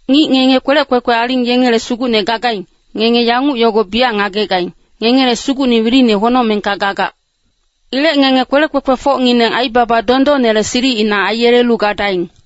Ngic ngenge kwelec kwekwe aling yengele sugucne gagaing, ngenge yanguc yogo biyac ngagegaing, ngengele Sugucne wilini honocmengka gagac. Ilec ngenge kwelec kwekwefocngineng aibaba dondonnele silicina aiyelelu gadaing.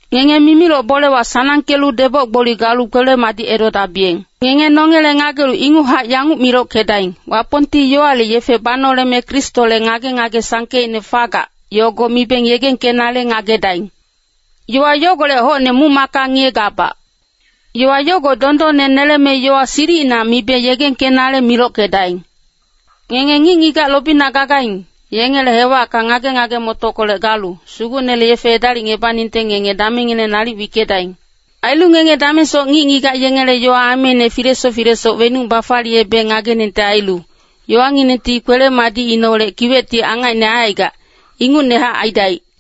Ngenge mimiloc bolewa sanangkelu deboc-gboli galu kwele-madic edodabiyeng. Ngenge nongele ngagelu inguchac yanguc milockedaing, Wapongti yowale yefe banoleme Kristole ngage-ngage sangkeicne fagac, yogo mibeng yegengkenale ngagedaing. Yowa yogolec hocne muc-macka ngiyegabac. Yowa yogo dondonne neleme yowa silicina mibe yegengkenale milockedaing. Ngenge ngic-ngigac lobina gagaing, yengele hewacka ngage-ngage-motockolec galu, Sugucnele yefe edalicebaningte ngenge damengngineng nalic wickedaing. Ailu ngenge damengsoc ngic-ngigac yengele yowa ameine filesoc filesoc wenuc bafaliyebeng ngageningte ailu, yowanginengti kwele-madicineholec kiwecti angacine aicaigac, ingucnehac aidaic.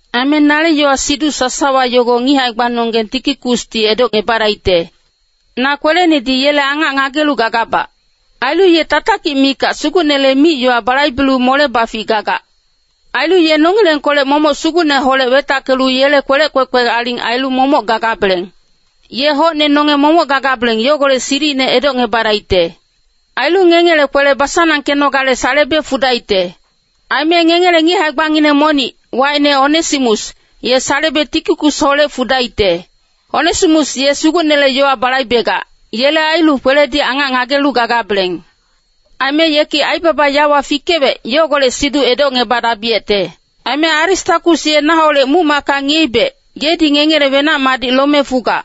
Aime nale yowa-siduc sasawa yogo ngic hae-gbanonggeng Tikikusdi edocebadaicte. Na kwelenedi yele angac ngagelu gagabac. Ailu ye tatakic mikac Sugucnele mic-yowa balaibelu mole-bafic gagac. Ailu ye nongilengkolec momoc Sugucneholec wetackelu yele kwelec kwekwe aling ailu momoc gagabeleng. Ye hocne nonge momoc gagabeleng yogolec silicine edocngebadaicte. Ailu ngengele kwele basanangkenogale salebe fudaicte. Aime ngengele ngic hae-gbangineng monic, wacine Onesimus, ye salebe Tikikusholec fudaicte. Onesimus ye Sugucnele yowa balaibegac, yele ailu kweledi angac ngagelu gagabeleng. Aime yeki aibaba yawa fikewec, yogolec siduc edocngebadabiyecte. Aime Aristakus ye naholec muc-macka ngiyeibec, yedi ngengele wenac-madic lome fugac.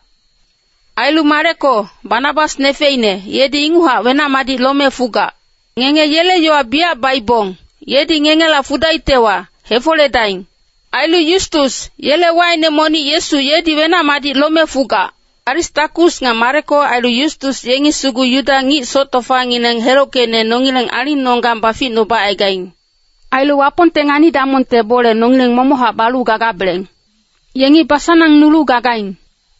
Ailu Mareko, Banabas nefeine, yedi inguchac wenac-madic lome fugac. Ngenge yele yowa biyac baibong, yedi ngengela fudaictewa, hefoledaing. Ailu Yustus, yele wacine monic Yesu yedi wenac-madic lome fugac. Aristakus nga Mareko ailu Yustus yengi sugu Yuda ngic soc tofangineng helockeicne nongileng alingnonggang baficnubacaigaing. Ailu Wapongte ngani-damongte bole nongileng momochac balu gagabeleng. Yengi basanangnulu gagaing.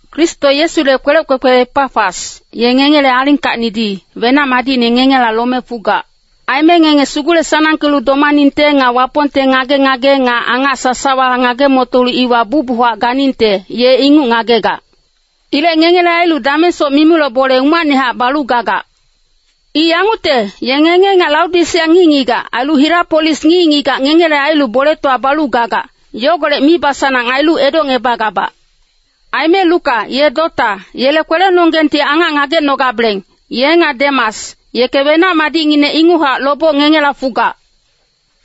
Kristo Yesule kwelec kwekwe Epafas, ye ngengele alingkacnidi, wenac-madicine ngengela lome fugac. Aime ngenge sugule-sanangkelu domaningte nga Wapongte ngage-ngage nga angac sasawa ngage-motolu iwa bucbuchac ganingte, ye inguc ngagegac. Ilec ngengele ailu damengsoc mimiloc bole umacnehac balu gagac. I yangucte, ye ngenge nga Laodisea ngic-ngigac, ailu Hirapolis ngic-ngigac ngengele ailu boletowa balu gagac, yogolec mibasanang ailu edocngebagabac. Aime Luka, ye dota, yele kwelenonggengti angac ngagecnogabeleng, ye nga Demas, yeke wenac-madicnginec inguchac loboc ngengela fugac.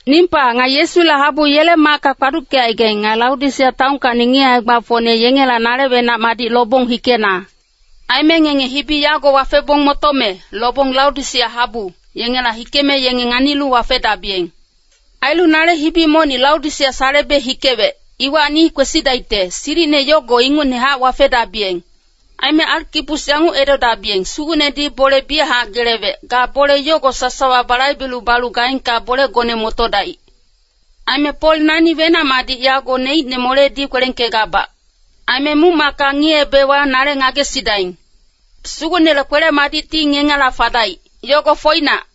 Nimpa, nga Yesule habu yele macka kpaduckecaigaing, nga Laodisea taonkacni ngic hae-gbafocne yengela nale wenac-madic lobong hikena. Aime ngenge hibi yago wafebong motome, lobong Laodisea habu, yengela hikeme yenge nganilu wafedabiyeng. Ailu nale hibi monic Laodisea salebe hikewec, iwacni kwesidaicte, silicine yogo ingucnehac wafedabiyeng. Aime Arkipus yanguc edodabiyeng, “Sugucnedi bole biyachac gelewec, ga bole yogo sasawa balaibelu balu gaengka bolegone motodaic.” Aime Pol nani wenac-madic yago neicne moledi kwelengkegabac. Aime muc-macka ngiyeebewa nale ngagesidaing. Sugucnele kwele-madicti ngengela fadaic. Yogo foinac.